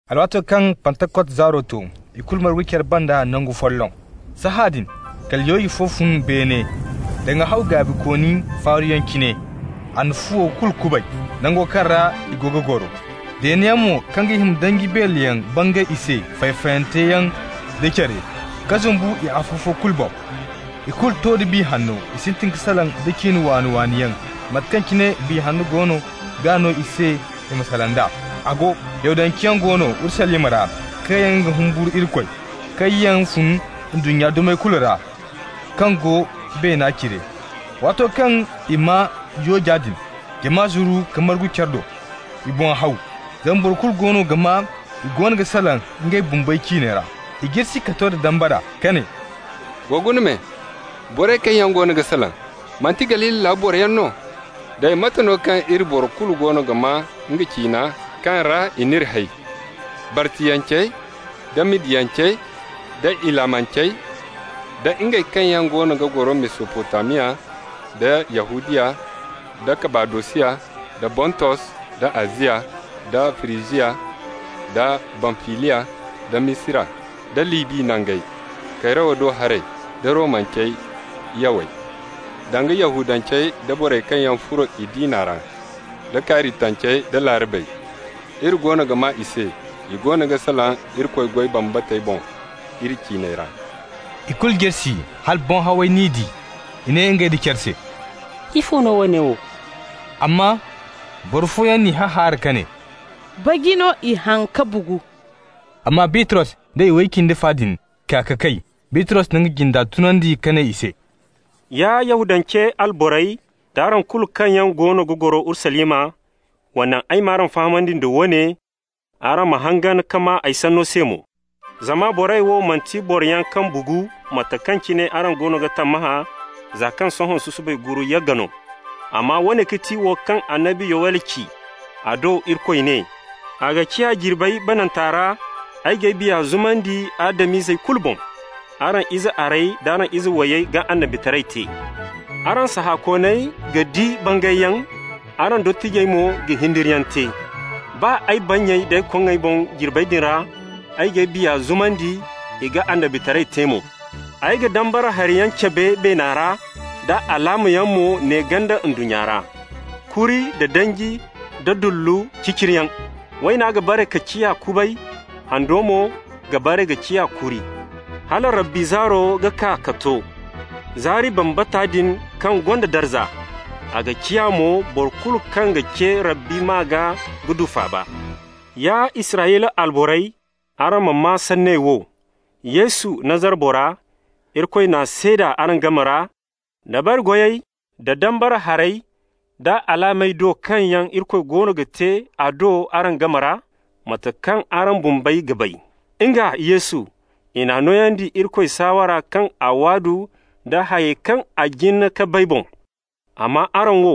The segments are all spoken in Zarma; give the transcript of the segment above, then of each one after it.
Alwaato kaŋ Pantakot zaaro to, ikulu margu care banda nangu folloŋ. Sahãadin kala yooje fo fun beene, danga haw gaabikooni faaruyaŋ cine. A na fuwo kulu kubay, nango kaŋ ra i go ga goro. Deeneyaŋ mo kaŋ ga hima danji beeleyaŋ bangay i se, fay-fayante yaŋ da care, ka zumbu i afo-fo kulu boŋ. Ikulu to da Biya Hanno. I sintin ka salaŋ da ciine waani-waani yaŋ, mate kaŋ cine Biya goono ga no i se i ma salaŋ d'a. A go, Yahudanceyaŋ go no Urusalima ra, kaŋ yaŋ ga humburu Irikoy, kaŋ yaŋ fun ndunnya dumey kulu ra kaŋ go beena cire. Waato kaŋ i maa yooja din, jama zuru ka margu care do. I boŋ haw, zama boro kulu goono ga maa i goono ga salaŋ ngey bumbey ciiney ra. I jirsi ka to da dambara, ka ne: «Wa guna me, borey kaŋ yaŋ goono ga salaŋ, manti Galili laabu boroyaŋ no? Day, mate no kaŋ iri boro kulu goono ga maa nga ciina kaŋ ra i n'iri hay? Bartiyancey, da Madiyancey, da Ilamancey, da ngey kaŋ yaŋ goono ga goro Mesopotamiya, da Yahudiya, da Kabadosiya, da Bontos, da Aziya, da Firijiya, da Bamfiliya, da Misira, da Libi nangey, Kayrawa do haray, da Romance yawey, danga Yahudancey da borey kaŋ yaŋ furo i diina ra, da Karitancey da Laarabey -- iri goono ga maa i se, i goono ga salaŋ Irikoy goy bambatey boŋ iri ciiney ra.» Ikulu jirsi hala boŋ haway n'i di. I ne ngey nda care se: «Ifo no woone wo?» Amma boro fooyaŋ n'i hahaara ka ne: «Baji no i haŋ ka bugu.» Amma Bitros da iway cindi fa din kaa ka kay. Bitros na nga jinde tunandi ka ne i se: «Ya Yahudance alborey, d'araŋ kulu kaŋ yaŋ goono ga goro Urusalima, wa naŋ ay m'araŋ fahamandi da woone, araŋ ma hangan ka maa ay sanno se mo. Zama borey wo manti boroyaŋ kaŋ bugu, mate kaŋ cine araŋ goono ga tammahã, za kaŋ sohõ susubay guuru yagga no. Amma woone ga ti wo kaŋ annabi Yowel ci. A do Irikoy ne: ‹A ga ciya jirbey bananta ra, ay g'ay Biya zumandi Adam-izey kulu boŋ. Araŋ ize arey d'araŋ ize wayey ga annabitaray te, araŋ sahãkooney ga di bangayyaŋ, araŋ dottijey mo ga hindiriyaŋ te. Baa ay bannyey d'ay koŋŋey boŋ jirbey din ra, ay g'ay Biya zumandi, i ga annabitaray te mo. Ay ga dambara hariyaŋ cabe beena ra, da alaamayaŋ mo ne ganda ndunnya ra: kuri, da danji, da dullu ciciriyaŋ. Wayna ga bare ka ciya kubay, hando mo ga bare ka ciya kuri, hala Rabbi zaaro ga kaa ka to, zaari bambata din kaŋ gonda darza. A ga ciya mo, boro kulu kaŋ ga ce Rabbi maa gaa ga du faaba.› Ya Israyla alborey, araŋ ma maa sanney wo: Yesu, Nazara bora, Irikoy n'a seeda araŋ game ra, dabari goyey da dambara harey da alaamey do kaŋ yaŋ Irikoy goono ga te a do araŋ game ra, mate kaŋ araŋ bumbey ga bay. Nga, Yesu, i n'a nooyandi Irikoy saawara kaŋ a waadu da hayey kaŋ a jin ka bay boŋ. Amma araŋ wo,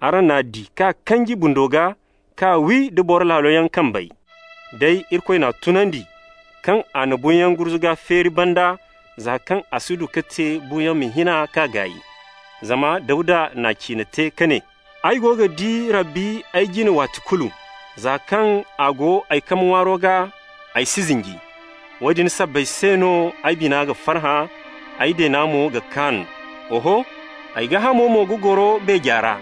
araŋ n'a di k'a kanji bundo gaa, k'a wi da boro laaloyaŋ kambey. Day Irikoy n'a tunandi, kaŋ a na buuyaŋ gurzuga feeri banda, za kaŋ a si du ka te buuyaŋ ma hin k'a gaay. Zama Dawda n'a ciine te ka ne: ‹Ay go ga di Rabbi ay jine waati kulu. Za kaŋ a go ay kambe ŋwaaro gaa, ay si zinji. Woodin sabbay se no ay bina ga farhã, ay deena mo ga kaan. Oho, ay gaahamo mo ga goro beeje ra.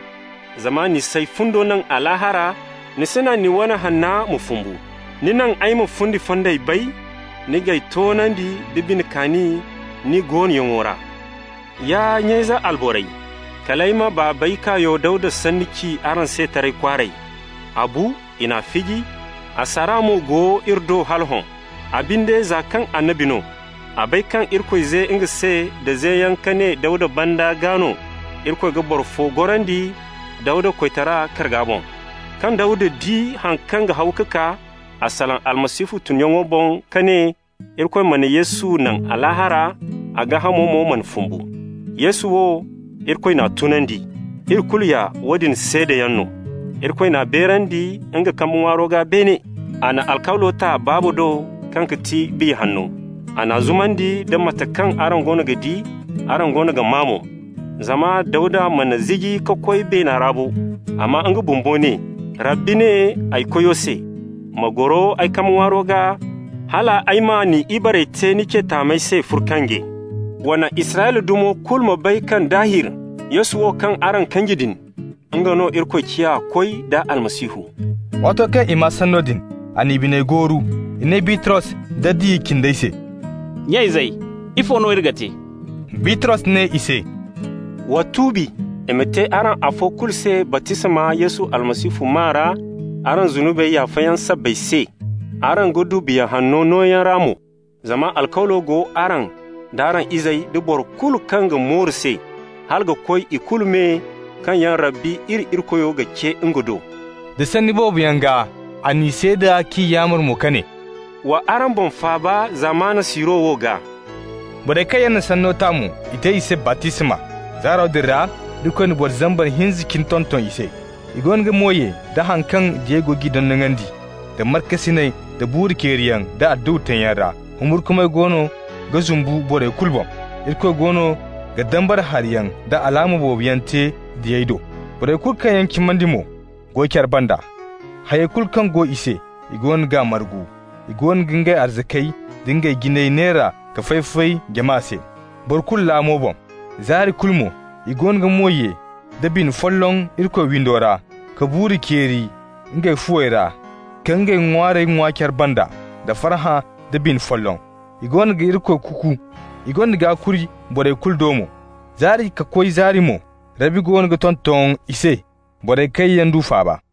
Zama ni s'ay fundo naŋ Alaahara, ni si naŋ ni wane Hanna ma fumbu. Ni naŋ ay ma fundi fondey bay, ni g'ay toonandi nda bine kaani ni goonoyaŋo ra.› Ya nya-ize alborey, kal ay ma baabey kaayo Dawda sanni ci araŋ se taray kwaaray. A bu, i n'a fiji, a saara mo go iri do hala hõ. A binde, za kaŋ annabi no, a bay kaŋ Irikoy ze nga se da zeyaŋ ka ne Dawda banda gaa no Irikoy ga boro fo gorandi Dawda koytaray karga boŋ. Kaŋ Dawda di haŋ kaŋ ga haw ka kaa, a salaŋ Almasihu tunyaŋo boŋ ka ne Irikoy mana Yesu naŋ Alaahara, a gaahamo mo mana fumbu. Yesu wo, Irikoy n'a tunandi. Iri kulu ya woodin seedayaŋ no. Irikoy n'a beerandi nga kambe ŋwaaro gaa beene. A na alkawlo ta Baaba do kaŋ ga ti Biya Hanno. A n'a zumandi da mate kaŋ araŋ goono ga di, araŋ goono ga maa mo. Zama Dawda mana ziji ka koy beena ra bo, amma nga bumbo ne: ‹Rabbi ne ay Koyo se: Ma goro ay kambe ŋwaaro gaa, hala ay ma ni ibarey te ni ce taamey se furkange.› Wa naŋ Israyla dumo kulu ma bay kaŋ daahir Yesu wo kaŋ araŋ kanji din, nga no Irikoy ciya Koy da Almasihu.» Waato kaŋ i maa sanno din, a n'i biney gooru. I ne Bitros da diya cindey se: «Nya-izey, ifo no iri ga te?» Bitros ne i se: «Wa tuubi. I ma te araŋ afo kulu se baptisma Yesu Almasihu maa ra araŋ zunubi yaafayaŋ sabbay se, araŋ ga du Biya Hanno nooyaŋ ra mo. Zama alkawlo go araŋ, d'araŋ izey, da boro kulu kaŋ ga mooru se, hala ka koy i kulu me kaŋ yaŋ Rabbi iri Irikoyo ga ce nga do.» Da sanni boobo yaŋ gaa a n'i seeda k'i yaamar mo ka ne: «Wa araŋ boŋ faaba zamana siiro wo gaa.» Borey kaŋ yaŋ n'a sanno ta mo, i te i se baptisma. Zaaro din ra Irikoy na boro zambar hinza cine tonton i se. I goono ga mo ye da haŋ kaŋ diyey go g'i dondonandi, da markasinay, da buuru ceeriyaŋ da adduwa teeyaŋ ra. Humburkumay goono ga zumbu borey kulu boŋ. Irikoy goono ga dambara hariyaŋ da alaama boobo yaŋ te diyey do. Borey kulu kaŋ yaŋ cimandi mo go care banda. Hay kulu kaŋ go i se, i goono g'a margu. I goono ga ngey arzakey da ngey jiney neera ka fay-fay jama se, boro kulu laamo boŋ. Zaari kulu mo i goono ga mo ye da bine folloŋ Irikoy windo ra, ka buuru ceeri ngey fuwey ra, ka ngey ŋwaarey ŋwa care banda da farhã da bine folloŋ. I goono ga Irikoy kuuku, i gonda gaakuri borey kulu do mo. Zaari ka koy zaari mo, Rabbi goono ga tonton i se borey kaŋ yaŋ du faaba.